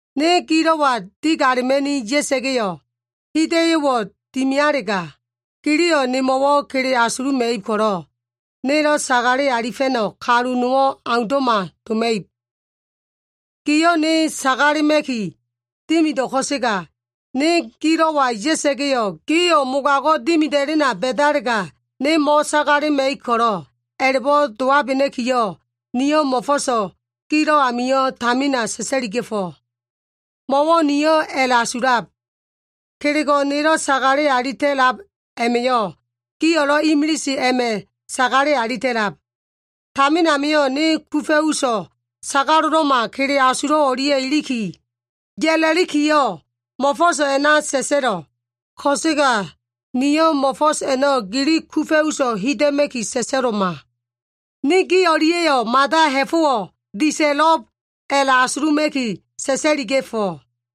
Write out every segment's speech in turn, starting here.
Ne gilo꞉wa digalema꞉ni ya꞉sa꞉ga꞉yo꞉, hida꞉yo꞉wo꞉ dimialega, giliyo꞉ nemo꞉wo꞉ kele asuluma꞉ib ko꞉lo꞉, nelo꞉ sagale alifa꞉no꞉ kalu nowo꞉ aundo꞉ma doma꞉ib. Gio꞉ ne sagalema꞉ki dimido꞉ ko꞉sega, ne gilo꞉wa ya꞉sa꞉ga꞉yo꞉, gio꞉ mogago꞉ dimida꞉lena ba꞉dalega, ne mo꞉sagalema꞉ib ko꞉lo꞉, a꞉la꞉bo꞉ dowabena꞉kiyo꞉, niyo꞉ mo꞉fo꞉so꞉ gilo꞉ amio꞉ tamina sa꞉sa꞉liga꞉fo꞉. Mo꞉wo꞉ niyo꞉ a꞉la꞉asulab, kelego꞉ nelo꞉ sagale alita꞉lab a꞉ma꞉yo꞉, gio꞉lo꞉ imilise a꞉ma꞉ka sagale alita꞉lab. Tamin amio꞉ ne kufa꞉ uso꞉ sagalo꞉lo꞉ma kele asulo꞉ o꞉lia꞉ iliki, ya꞉la꞉likiyo꞉ mo꞉fo꞉so꞉ a꞉na sa꞉sa꞉lo꞉. Ko꞉sega niyo꞉ mo꞉fo꞉s a꞉no꞉ gili kufa꞉ uso꞉ hida꞉ma꞉ki sa꞉sa꞉lo꞉ma. Ne gi o꞉lia꞉yo꞉ mada ha꞉fo꞉wo꞉ disa꞉lo꞉b a꞉la꞉asuluma꞉ki sa꞉sa꞉liga꞉fo꞉.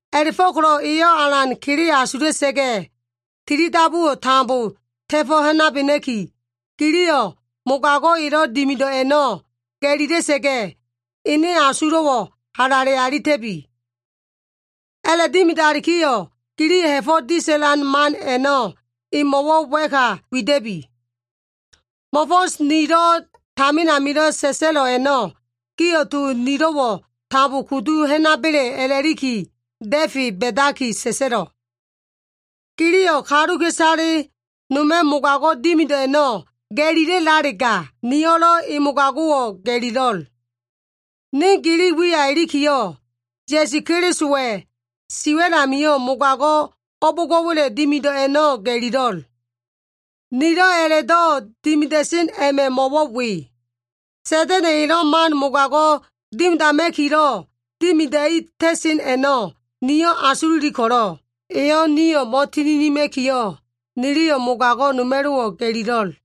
A꞉la꞉fo꞉ko꞉lo꞉ eyo꞉ alan kele asula꞉sa꞉ga꞉ tilidabuwo꞉ tambo ta꞉fo꞉ ha꞉nabena꞉ki, giliyo꞉ mogago꞉ elo꞉ dimido꞉ a꞉no꞉ ga꞉lila꞉sa꞉ga꞉, ene asulo꞉wo꞉ halale alita꞉bi. A꞉la꞉dimidalikiyo꞉, giliyo꞉ ha꞉fo꞉ disa꞉lan man a꞉no꞉ emo꞉wo꞉ wa꞉ka wida꞉bi. Mo꞉fo꞉s nilo꞉ tamin amilo꞉ sa꞉sa꞉lo꞉ a꞉no꞉ gio꞉ to nilo꞉wo꞉ tambo kudu ha꞉naba꞉le a꞉la꞉liki da꞉fe ba꞉daki sa꞉sa꞉lo꞉. Giliyo꞉ kaluka꞉isale noma꞉ mogago꞉ dimido꞉ a꞉no꞉ ga꞉lila꞉lalega, niyo꞉lo꞉ mogago꞉ elo꞉ a꞉no꞉ ga꞉lilo꞉l. Ne gili wiya ilikiyo꞉, Ya꞉su Kelisowa꞉ si wa꞉l amio꞉ mogago꞉ o꞉bo꞉ngo꞉wa꞉le dimido꞉ a꞉no꞉ ga꞉lilo꞉l. Nilo꞉ a꞉la꞉do꞉ dimida꞉sen a꞉ma꞉ mo꞉wo꞉ we. Sa꞉da꞉na꞉ elo꞉ man mogago꞉ dimidama꞉kilo꞉ dimidai ta꞉sen a꞉no꞉ nio꞉ asululi ko꞉lo꞉, eyo꞉ nio꞉ mo꞉tininima꞉kiyo꞉, niliyo꞉ mogago꞉ noma꞉lo꞉wo꞉ ga꞉lilo꞉l.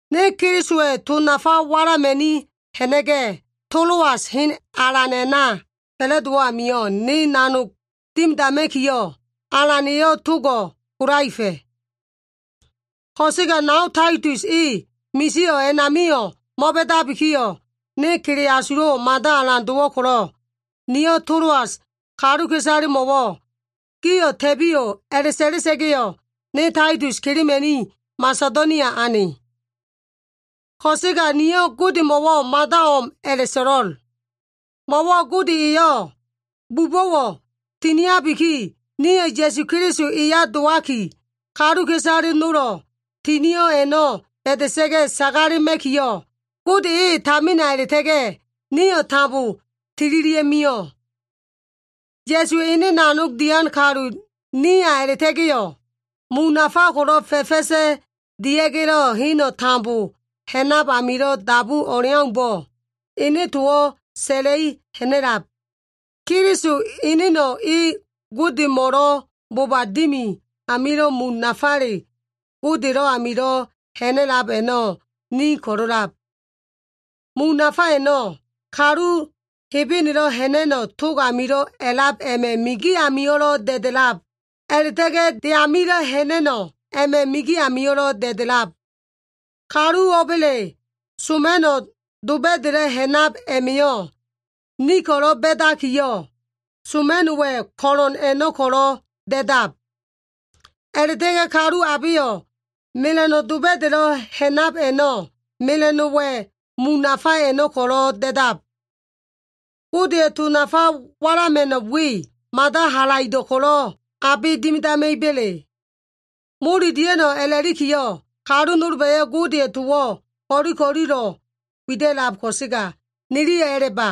Ne Kelisowa꞉ to nafa walama꞉ni ha꞉na꞉ga꞉, Toloas hen alan a꞉na fa꞉la꞉dowo꞉ amio꞉, ne nanog dimidama꞉kiyo꞉, Alan eyo꞉ togo꞉ kolaefa꞉. Ko꞉sega nao Taitus e misio꞉ a꞉namio꞉ mo꞉ba꞉dabikiyo꞉, ne kele asulo꞉wo꞉ mada alan dowo꞉ ko꞉lo꞉, niyo꞉ Toloas kaluka꞉isalemo꞉wo꞉ “gio꞉ ta꞉biyo꞉” a꞉la꞉sa꞉la꞉sa꞉ga꞉yo꞉, ne Taitus kelema꞉ni Masedonia ane. Ko꞉sega niyo꞉ Godemo꞉wo꞉ mada o꞉m a꞉la꞉so꞉lo꞉l. Mo꞉wo꞉ Gode eyo꞉ bubo꞉wo꞉ tiniabiki, nio꞉ Ya꞉su Keliso eya dowaki, kaluka꞉isale nolo꞉ tinio꞉ a꞉no꞉ ba꞉da꞉sa꞉ga꞉ sagalema꞉kiyo꞉, Gode e tamina a꞉la꞉ta꞉ga꞉, nio꞉ tambo tililia꞉mio꞉. Ya꞉suwa꞉ ene nanogdo꞉ dian kalu niya a꞉la꞉ta꞉ga꞉yo꞉, mun nafa ko꞉lo꞉ fa꞉fa꞉sa꞉ dia꞉ga꞉lo꞉ heno꞉ tambo ha꞉nab amilo꞉ dabu o꞉leaumbo꞉, ene towo꞉ sa꞉la꞉i ha꞉na꞉lab. Keliso eneno꞉ e Godemo꞉lo꞉ boba dimi amio꞉, mun nafale Godelo꞉ amilo꞉ ha꞉na꞉lab a꞉no꞉ ni ko꞉lo꞉lab. Mun nafa a꞉no꞉, kalu Hebenelo꞉ ha꞉na꞉no꞉ tog amilo꞉ a꞉lab a꞉ma꞉ migi amio꞉lo꞉ da꞉da꞉lab, a꞉la꞉ta꞉ga꞉ de amilo꞉ ha꞉na꞉no꞉ a꞉ma꞉ migi amio꞉lo꞉ da꞉da꞉lab. Kalu o꞉ba꞉le soma꞉no꞉ doba꞉da꞉lo꞉ ha꞉nab a꞉ma꞉yo꞉, ni ko꞉lo꞉ ba꞉dakiyo꞉ soma꞉no꞉wa꞉ ko꞉lo꞉n a꞉no꞉ ko꞉lo꞉ da꞉dab. A꞉la꞉ta꞉ga꞉ kalu abeyo꞉ mela꞉no꞉ doba꞉da꞉lo꞉ ha꞉nab a꞉no꞉, mela꞉no꞉wa꞉ mun nafa a꞉no꞉ ko꞉lo꞉ da꞉dab. Godeya꞉ to nafa walama꞉no꞉ we, mada halaido꞉ ko꞉lo꞉ abe dimidama꞉iba꞉le? Mole dia꞉no꞉ a꞉lakiyo꞉, kalu nolba꞉yo꞉ Godeya꞉ towo꞉ ko꞉li ko꞉lilo꞉ wida꞉lab ko꞉sega, niliyo꞉ a꞉la꞉ba.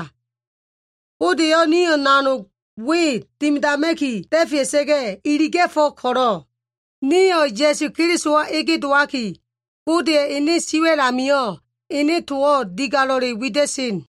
Gode eyo꞉ nio꞉ nanog we dimidama꞉ki da꞉fea꞉sa꞉ga꞉ iliga꞉fo꞉ ko꞉lo꞉, nio꞉ Ya꞉su Kelisowa ege dowaki, Godeya꞉ ene siwa꞉l amio꞉ ene towo꞉ digalo꞉le wida꞉sen.